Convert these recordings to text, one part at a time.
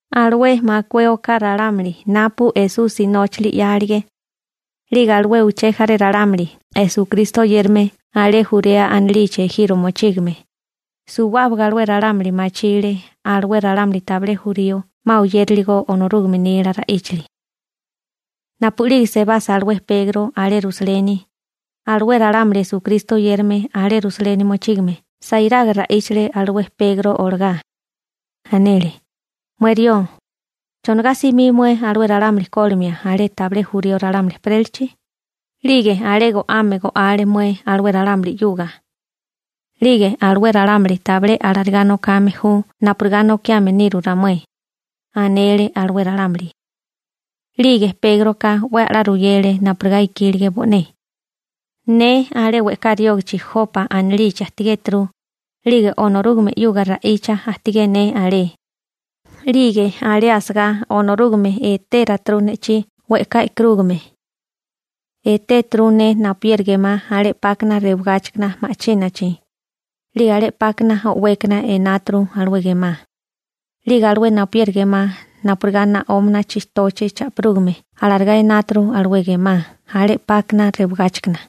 Alué makué oká ralámuli napu Esusi nóchili 'yálige, 'lige alué uché jaré ralámuli Esukristo oyérame alé Jurea anilichi ejiro mochígame, suwábaga alué ralámuli machile alué ralámuli tabilé jurío 'ma oyériligo Onorúgame nila ra'íchali. Napu'lige sebasa alué Pegro alé Rusaleni, alué ralámuli Esukristo oyérame alé Rusaleni mochígame sairaga ra'íchale alué Pegro olagá. Anele: ―Mué rió, ¿chonigá simí mué alué ralámuli kólimia alé tabilé jurío ralámuli ejperélachi? 'Lige alé go'ame go'ale mué alué ralámuli 'yuga. 'Lige alué ralámuli tabilé alarigá nokame ju napurigá nokiame niru ramué. ―anele alué ralámuli. 'Lige Pégroka 'we a'lá ruyele napurigá ikílige bo'né: ―Ne alé we'ká riógachi Jopa anilichi ajtigéturu. 'Lige Onorúgame 'yuga ra'icha ajtigé ne alé. 'Lige alé asagá Onorúgame etératuru ne'chí we'ká e'karúgame. Etéturu ne napuyeri gemá alé 'pákana rewagáchikana ma'chínachi. 'Lige alé 'pákana o'wékana enáturu alué gemá. 'Lige alué napuyeri gemá napurigá naógana chitochi cha'pirúgame alarigá enáturu alué gemá alé 'pákana rewagáchikana.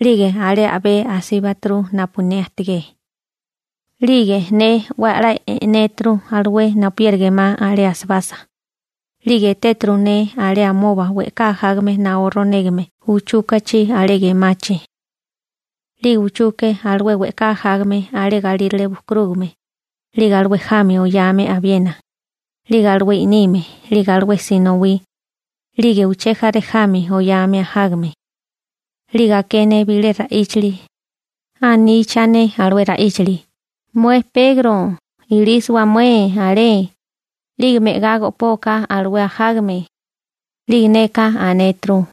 'Lige alé a'bé asíbaturu napu ne ajtigé. 'Lige ne 'we a'lá e'néturu alué napuyeri gemá alé asibasa. 'Lige etéturu ne alé amoba we'ká ajágame naó ronégame uchúkachi alé gemachi. 'Lige uchuke alué we'ká ajágame alé galírale bukurúgame, 'lige alué jami oyame abiena, 'lige alué i'nime, 'lige alué sinowí, 'lige uché jaré jami oyame ajágame. 'Lige aké ne bilé ra'íchili. Aníchane alué ra'íchili: «Mué Pegro, ilísiwa mué alé, 'lige me'gá go'poa alué ajágame.» 'Lige neka anéturu: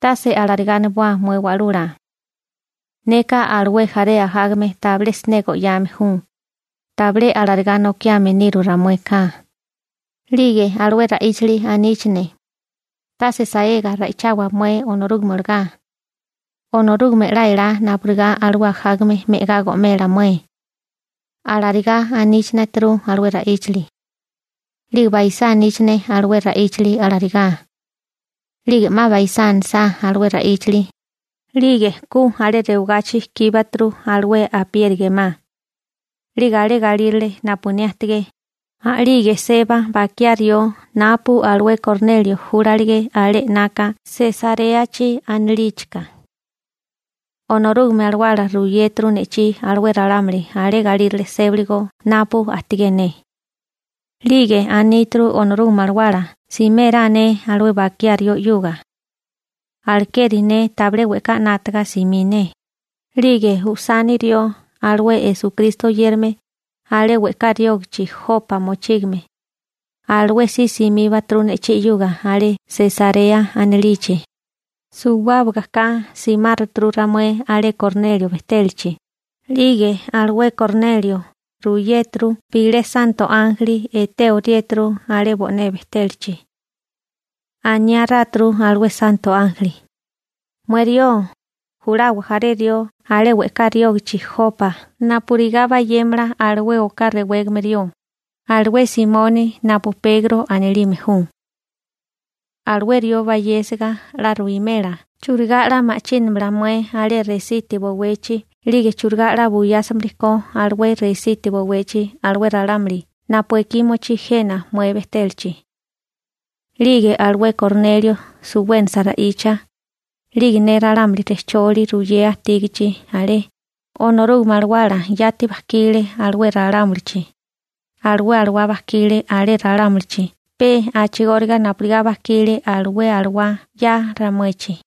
«Tase alarigá aniboa mué Wa'lula. Neka alué jaré ajágame tabilé siné go'yame ju, tabilé alarigá nokiame niru ramueka.» 'Lige alué ra'íchili aníchane: «Tase saega ra'ichawa mué Onorúgame olagá. Onorúgame 'la elá napurigá alué ajágame me'gá go'mela mué», alarigá aníchaneturu alué ra'íchili. 'Lige baisá aníchane alué ra'íchili alarigá. 'Lige 'ma baisá anisá alué ra'íchili, 'lige ku alé rewagachi kíbuturu alué apieri gemá. 'Lige alé galírale napu ne ajtigé, a'lige seba bakiá rió napu alué Kornelio júlalige alé 'naka Sesaréachi anilíchika. Onorúgame Alawala ruyéturu ne'chí alué ralámuli alé galírale sébaligo napu ajtigé ne. 'Lige aníturu Onorúgame Alawala simérá ne alué bakiá rió 'yuga. Alekeri ne tabilé we'ká 'nátaga simí ne. 'Lige usani rió alué Esukristo oyérame alé we'ká riógichi Jopa mochígame, alué si simíbaturu ne'chí 'yuga alé Sesarea anilichi. Suwábaga ka simáruturu ramué alé Kornelio bejtélachi. 'Lige alué Kornelio ruyéturu bilé santo ánjeli etéoriéturu alé bo'né bejtélachi. Aniáráturu alué santo ánjeli: «Mué rió, julawa jaré rió alé we'ká riógichi Jopa napurigá bayémala alué oká rewégame rió, alué Simoni napu Pegro anilime ju. Alué rió bayésiga 'la ruwimela churigá 'la ma'chínamala mué alé resiti bowechi 'lige churigá 'la buyásimili ko alué resiti bowechi alué ralámuli napu ekí mochí jena mué bejtélachi.» 'Lige alué Kornelio suwénasa ra'icha, 'lige ne ralámuli rejcholi ruyea ajtígichi alé, Onorúgame Alawala yati bajkile alué ralámulichi. Alué alawá bajkile alé ralámulichi pe a'chigóriga napurigá bajkile alué alawá 'ya ramuechi.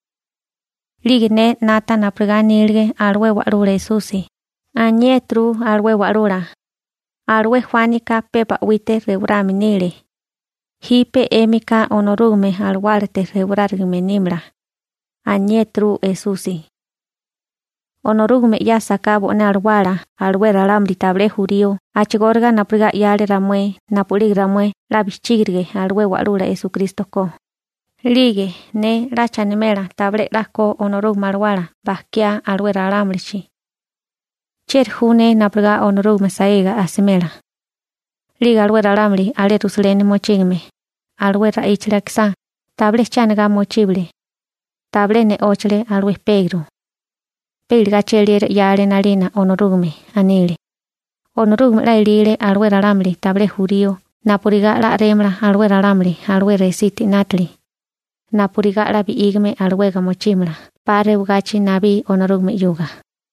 'Lige ne 'nata napurigá anílige alué Wa'lula Esusi. Aniéturu alué Wa'lula: «Alué Juánika pe ba'wite rewarame nile. Jipe 'émika Onorúgame Alawálate rewarárigame nímala», aniéturu Esusi. Onorúgame 'yásaká bo'né Alawala alué ralámuli tabilé jurío a'chigóriga napurigá 'yale ramué napu'lige ramué 'la bijchígirige alué Wa'lula Esukristo ko, 'lige ¿ne 'lacha animela tabilé 'la ko Onorúgame Alawala bajkiá alué ralámulichi? ¿Chieri ju ne napurigá Onorúgame saega asimela? 'Lige alué ralámuli alé Rusaleni mochígame, alué ra'íchali akisá, tabilé che anigá mochíbale. Tabilé ne'óchale alué Pegro. Pe iligá cheliera 'yale 'nalina Onorúgame. Anile: ―¡Onorúgame 'la elile alué ralámuli tabilé jurío napurigá 'la a'rémala alué ralámuli alué resiti 'nátili, napurigá 'la bi'ígame alawega mochímala 'pa rewagachi nabí Onorúgame 'yuga!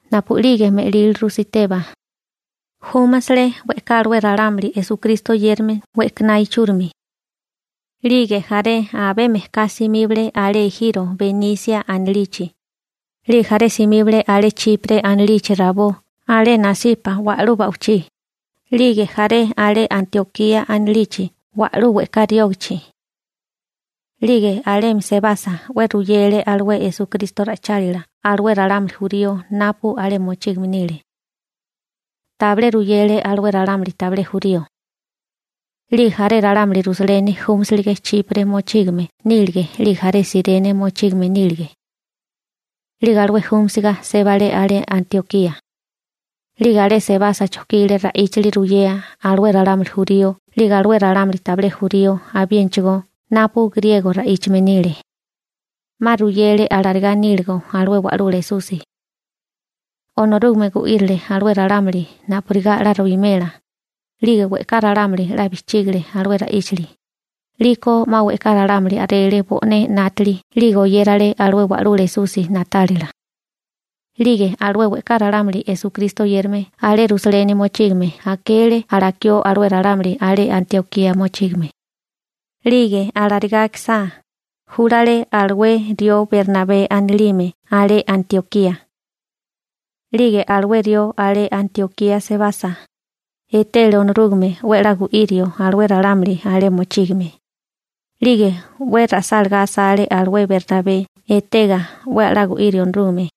Napu'lige me'líliru Siteba, júmasele we'ká alué ralámuli Esukristo oyérame we'kaná ichúrimi. 'Lige jaré abé mejká simíbale alé ejiro Benísia anilichi. 'Lige jaré simíbale alé Chipre anilichi rabó alé nasipa wa'lú ba'wichí, 'lige jaré alé Antiokía anilichi wa'lú we'ká riógichi. 'Lige alemi sebasa 'we ruyele alué Esukristo ra'ichálila alué ralámuli jurío napu alé mochígame nile. Tabilé ruyele alué ralámuli tabilé jurío. 'Lige jaré ralámuli Rusaleni júmasilige Chipre mochígame nílige 'lige jaré Sirene mochígame nílige. 'Lige alué júmisiga sébale alé Antiokía. 'Lige alé sebasa chojkile ra'íchali ruyea alué ralámuli jurío 'lige alué ralámuli tabilé jurío abiénachigó napu griego ra'íchame nile. 'Ma ruyele alarigá níligo alué Wa'lula Esusi. Onorúgame gu'irile alué ralámuli napurigá 'la ruwimela, 'lige we'ká ralámuli 'la bijchígile alué ra'íchali, 'liko 'ma we'ká ralámuli a'rele bo'né 'nátili 'lige oyérale alué Wa'lula Esusi na'tálila. 'Lige alué we'ká ralámuli Esukristo oyérame alé Rusaleni mochígame akele alakió alué ralámuli alé Antiokía mochígame. 'Lige alarigá akisá, júlale alué rió Bernabé anilime alé Antiokía. 'Lige alué rió alé Antiokía sebasa, etele Onorúgame 'we a'lá gu'irio alué ralámuli alé mochígame. 'Lige 'we ra'sálágá asale alué Bernabé etega 'we a'lá gu'írio Onorúgame,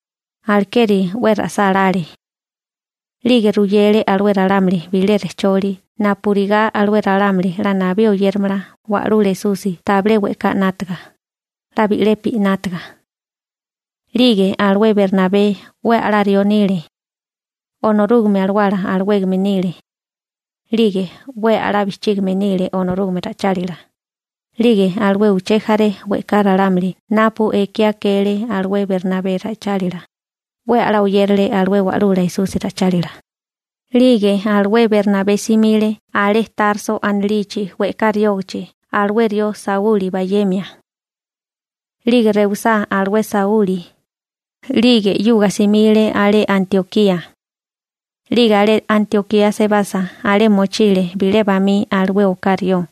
alekeri 'we ra'sálále. 'Lige ruyele alué ralámuli bilé rejcholi napurigá alué ralámuli 'la nabí oyéramala Wa'lula Esusi tabilé we'ká 'nátaga, 'la bi'lepi 'nátaga. 'Lige alué Bernabé 'we a'lá rió nile, Onorúgame Alawala alawégame nile. 'Lige 'we a'lá bijchígime nile Onorúgame ra'ichálila. 'Lige alué uché jaré we'ká ralámuli napu ekí akele alué Bernabé ra'ichálila, 'we a'lá oyérale alué Wa'lula Esusi ra'ichálila. 'Lige alué Bernabé simile alé Tarso anilichi we'ká riógichi alué rió Sauli bayemia. 'Lige rewisá alué Sauli, 'lige 'yuga simile alé Antiokía. 'Lige alé Antiokía sebasa alé mochile bilé bamí alué oká rió,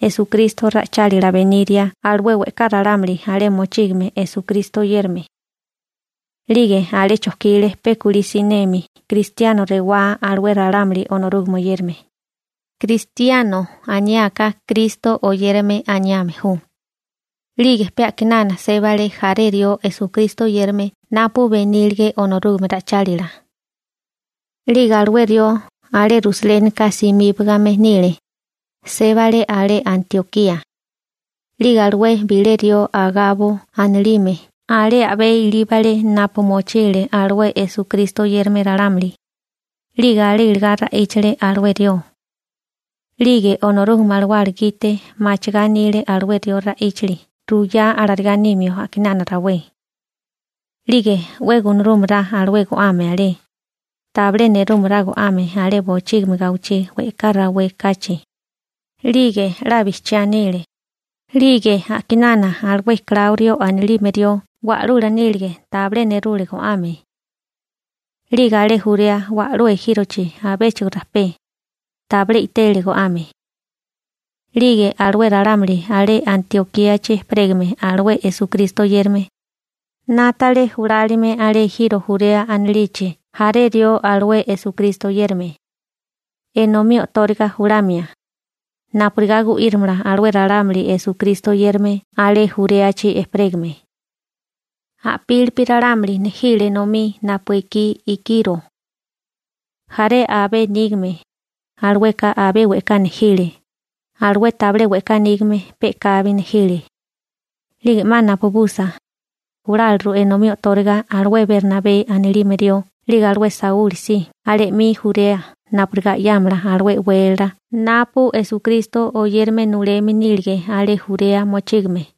Esukristo ra'ichálila beniria alué we'ká ralámuli alé mochígame Esukristo oyérame. 'Lige alé chojkile pe kulí siné «Kristiano» aniá alué ralámuli Onorúgame oyérame. «Kristiano» aniáká «Kristo Oyérame» aniame ju. 'Lige pe a'kinana sébale jaré rió Esukristo oyérame napu benílige Onorúgame ra'ichálila. 'Lige alué rió alé Rusalénika simíbagame nile. Sébale alé Antiokía. 'Lige alué bilé rió Agabo anilime alé a'bé ilíbale napu mochile alué Esukristo oyérame ralámuli. 'Lige alé iligá ra'íchale alué rió. 'Lige Onorúgame Alawala gite machigá anile alué rió ra'íchali ruyá alarigá nimio a'kinana rawé. 'Lige 'we gunarúmerá alué go'ame alé, tabilé nerúmará go'ame alé bochígimi gawichí we'ká rawé kachi. 'Lige 'la bijchiá nile. ('Lige a'kinana alué Kláurio anilime rió wa'lula nílige tabilé nerule go'ame. 'Lige alé Jurea wa'lú ejírochi abéchigo rajpé, tabilé i'tele go'ame.) 'Lige alué ralámuli alé Antiokíachi ejperégame alué Esukristo oyérame, 'nátale julálime alé ejiro Jurea anilichi jaré rió alué Esukristo oyérame, enomí o'tóriga julamia, napurigá gu'írimala alué ralámuli Esukristo oyérame alé Juréachi ejperégame. A'pílipi ralámuli nejile enomí napu ekí ikiro. Jaré abé nígame, alueka abé we'ká nejile, alué tabilé we'ká nígame pe'kabi nejile. 'Lige 'ma napabusa, juláliru enomí o'tóriga alué Bernabé anilime rió 'lige alué Sauli si alé 'mi Jurea napurigá 'yámala alué e'wélala napu Esukristo oyérame nuleme nílige alé Jurea mochígame.